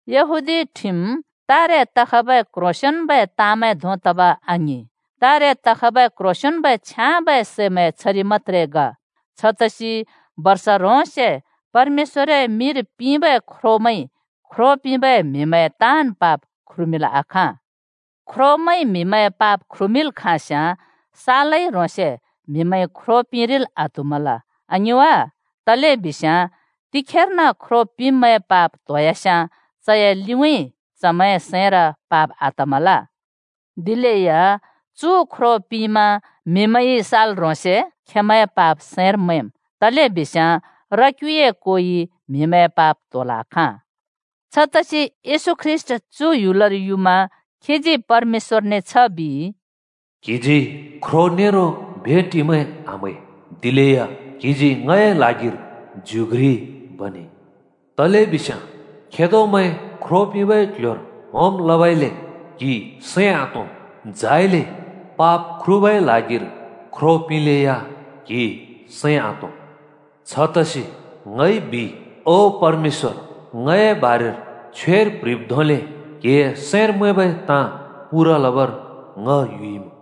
यहूदी ठिम तारे तखबै क्ह्रोंसेंन्बै ताँमैं धों तब आङिं, तारे तखबै क्ह्रोंसेंन्बै छ्याँबै सैमैंए छरि मत्‍त्रे ग। छतसि बर्ष ह्रोंसे परमेश्‍वरए मिंर पिंबै ख्रोमैंइ ख्रो पिंबै म्हिमैंए ताँन् पाप ख्रुमिंल् आखाँ। ख्रोमैंइ म्हिमैंए पाप ख्रुमिंल् खाँस्याँ सालै ह्रोंसे म्हिमैंइ ख्रो पिंरिल् आत्हुमल, आङिं वा? तलेबिस्याँ तिखेर्न ख्रो पिंब्मैंए पाप त्होयास्याँ, चए लिउँइँ चमैंए सैंर पाप आतमल। दिलेया चु ख्रो पिंमा म्हिमैंइ सालै ह्रोंसे खेंमैंए पाप सैंर मैंम्, तलेबिस्याँ र क्युए कोइ म्हिमैंए पाप त्होल् आखाँ। छतसि येशू ख्रीष्‍ट चु ह्‍युलर युमा खीजी परमेश्‍वरने छ बिइ, “क्‍हिजी ख्रो नेरो भेटिमैं आम्है, दिलेया क्‍हिजी ङए ल्हागिर ज्यु घ्रि बनेइ। तलेबिस्याँ खेदोमैं ख्रो पिंबै क्ल्ह्‍योर होम लबइले क्हि सैं आतों, झाइले पाप ख्रुबै ल्हागिर ख्रो पिंलेया क्हि सैं आतों। छतसि ङइ बिइ, ‘ओ परमेश्‍वर, ङए बारेर छ्वेर प्ह्रिब् धोंले क्हिए सैंर मैंबै ताँ पूरा लबर ङ युइमुँ।’”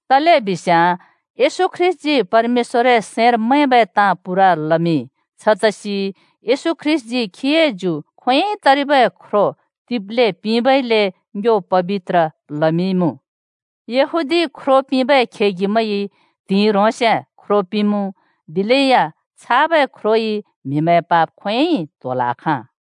तलेबिस्याँ येशू ख्रीष्‍टजी परमेश्‍वरए सैंर मैंबै ताँ पूरा लमिंइ। छतसि येशू ख्रीष्‍टजी खीए ज्यु खोंयोंइ तरिबै ख्रो तिब्ले पिंबइले ङ्यो पबित्र लमिंइमुँ। यहूदी ख्रो पिंबै खेगिमैंइ त्हिंइ ह्रोंसे ख्रो पिंमुँ। दिलेया छाबै ख्रोइ म्‍हिमैंए पाप खोंयोंइ त्होल् आखाँ।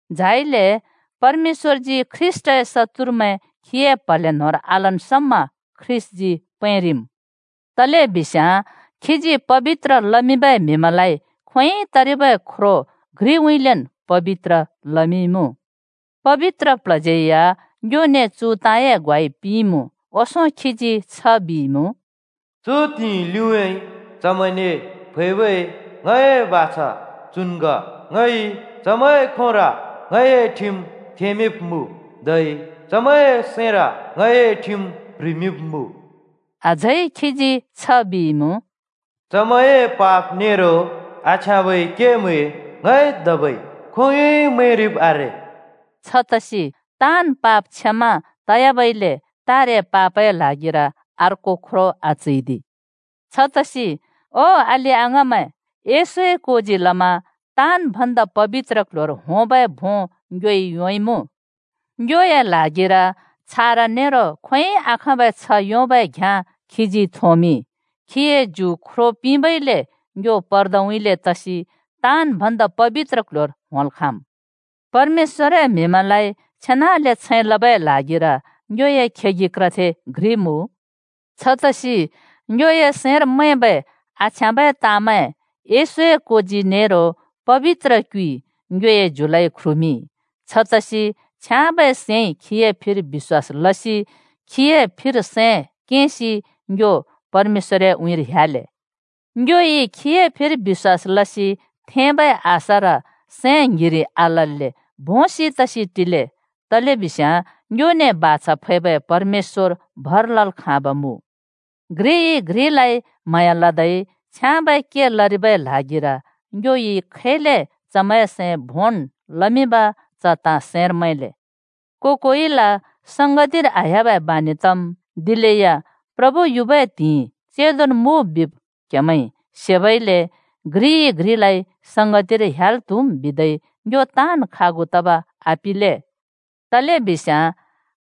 झाइले परमेश्‍वरजी ख्रीष्‍टए शत्तुरमैं खीए प्‍हले न्‍होंर आलन् समा ख्रीष्‍टजी पैंरिम्। तलेबिस्याँ खीजी पबित्र लमिंबै म्‍हिमैंलाइ खोंयोंइ तरिबै ख्रो घ्रिउँइँलेन् पबित्र लमिंइमुँ। पबित्र प्ल्हज्‍यै या ङ्योने चु ताँए ग्वाइ पिंइमुँ। ओंसों खीजी छ बिइमुँ, “चु त्हिंइ लिउँइँ चमैंने फैबै ङए बाछा चुन् ग, ङइ चमैंए खोंर ङए ठिम थेंमिंब्‍मुँ, धै चमैंए सैंर ङए ठिम प्‍ह्रिमिंब्‍मुँ।” अझै खीजी छ बिइमुँ, “चमैंए पाप नेरो आछ्याँबै केमैं ङइ धबै खोंयोंइ मैंरिब् आरे।” छतसि ताँन् पाप क्षमा तयाबइले तारे पापए ल्हागिर अर्को ख्रो आचैदि। छतसि ओ अलि-अङाँमैं, येशूए कोजी लमा “ताँन् भन्दा पबित्र क्‍ल्‍ह्‍योर” होंबै भों ङ्योइ योंइमुँ। ङ्योए ल्हागिर छारा नेरो खोंयोंइ आखाँबै छ्ह योंबै घ्याँ खीजी थोंमिंइ। खीए ज्यु ख्रो पिंबइले ङ्यो पर्दउँइँले तसि “ताँन् भन्दा पबित्र क्ल्ह्‍योर” होंल् खाँम्। परमेश्‍वरए म्‍हिमैंलाइ छेनाले छैं लबै ल्हागिर ङ्योए खेगि क्रथे घ्रि मुँ। छतसि ङ्योए आछ्याँबै सैंमैं चोखो लसि पबित्र क्युइ ङ्योए ज्यु ख्रुमिंइ, छतसि छ्याँबै सैंइ खीए फिर बिश्‍वास लसि खीए फिर सैं केंसि ङ्यो परमेश्‍वरए उँइँर ह्‍याले। ङ्योइ खीए फिर बिश्‍वास लसि थेंबै आशार सैं ङ्हिरि आलल्‍ले भोंसि तसि टिले, तलेबिस्याँ ङ्योने बाछा फैबै परमेश्‍वर भर लल् खाँब मुँ। घ्रिइ घ्रिलाइ म्हाँया लदै छ्याँबै के लरिबै ल्हागिर ङ्योइ खैले चमैंए सैं भोंन् लमिंब च ताँ सैंर मैंले। को-कोइल संगतिर आह्‍याबै बानि तम्, दिलेया प्रभु युबै त्हिंइ चेंदोन् मुँ बिब क्हेमैंइ सेबइले घ्रिइ घ्रिलाइ संगतिर ह्‍याल् त्हुम् बिदै ङ्यो ताँन् खागु तब आपिले। तलेबिस्याँ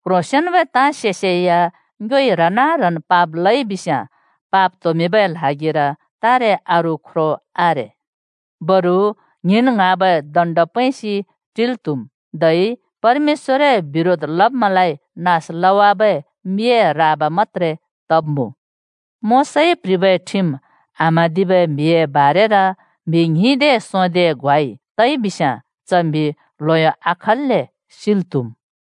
क्ह्रोसंन्बै ताँ सेसेया ङ्योइ ह्रना-ह्नन् पाप लइ बिस्याँ पाप त्होमिंबै ल्हागिर तारे अरू ख्रो आरे। बरु ङ्हिंन् ङ्हाँबै दण्ड पैंसि टिल् त्हुम्, धै परमेश्‍वरए बिरोध लब्‍मैंलाइ नास लवाबै मिए राबा मत्‍त्रे तब्मुँ। मोशाइ प्ह्रिबै ठिम आम्हाँदिबै म्हिए बारेर म्‍हि ‍ङ्हिंदे सोंदेए ग्वाइ तइ बिस्याँ च म्हि ल्हयो आयोंल्‍ले सिल् त्हुम्।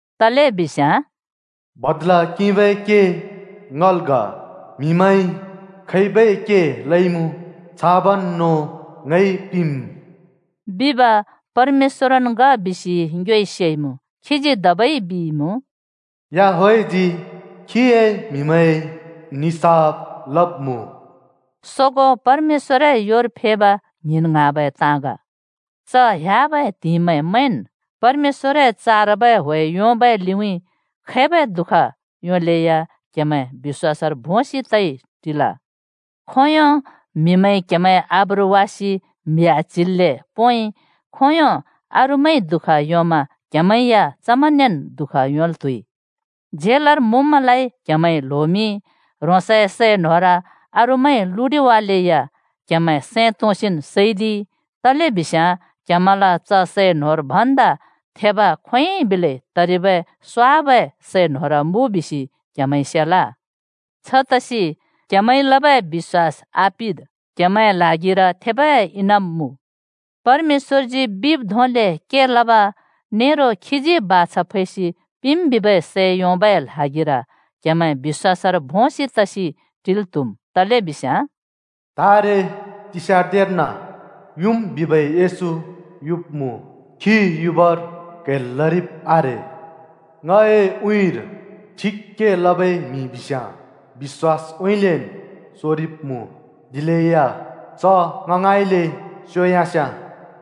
तलेबिस्याँ “बदला किंबै के ङल् ग, म्हिमैंइ खैबै के लइमुँ छाबन् नों ङइ पिंम्।” बिब परमेश्‍वरन् ग बिसि ङ्योइ सेइमुँ। खीजी धबै बिइमुँ, “याहवेहजी खीए म्‍हिमैंए निसाफ लब्‍मुँ।” सोगों परमेश्‍वरए योर फेब ङ्हिंन् ङ्हाँबै ताँ ग। च ह्‍याबै त्हिंइमैं मैंन्, परमेश्‍वरए चारबै ह्‍वे योंबै लिउँइँ खैबै दुःख योंलेया क्हेमैं बिश्‍वासर भोंसि तइ टिल। खोंयों म्हिमैंइ क्‍हेमैंए आब्रु वासि म्हि आच्हिल्‍ले पोंइ, खोंयों अरूमैंइ दुःख योंमा क्‍हेमैं या चमैंनेन् दुःख योंल् त्हुइ। झेलर मुँब्‍मैंलाइ क्हेमैंइ ल्होमिंइ, ह्रोंसए सै न्होर अरूमैंइ लुडिवालेया क्‍हेमैं सैं तोंसिन् सैदिइ, तलेबिस्याँ क्‍हेमैंल च सै न्होर भन्दा थेब खोंयोंन् बिलै तरिबै स्वाबै सै न्होर मुँ बिसि क्‍हेमैंइ सेल। छतसि क्‍हेमैंइ लबै बिश्‍वास आपिद्, क्हेमैंए ल्हागिर थेबै इनाम मुँ। परमेश्‍वरजी बिब् धोंले के लब नेरो खीजी बाछा फैसि पिंम् बिबै सै योंबै ल्हागिर क्हेमैं बिश्‍वासर भोंसि तइ टिल् त्हुम्। तलेबिस्याँ “तारे तिस्यार्न युम् बिबै येशू युब्‍मुँ, खी युबर क्‍हैल् लरिब् आरे। ङए उँइँर ठिक के लबै म्हि बिस्याँ बिश्‍वासउँइँलेन् सोरिब्मुँ, दिलेया च ङ ङाँइले स्योयास्याँ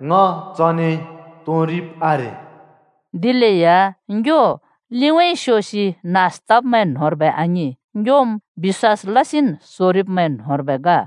ङ चने तोंरिब् आरे।” दिलेया ङ्यो लिउँइँ स्योसि नास तब्मैं न्होंर्बै आङिं, ङ्योम् बिश्‍वास लसिन् सोरिब्मैं न्होंर्बै ग।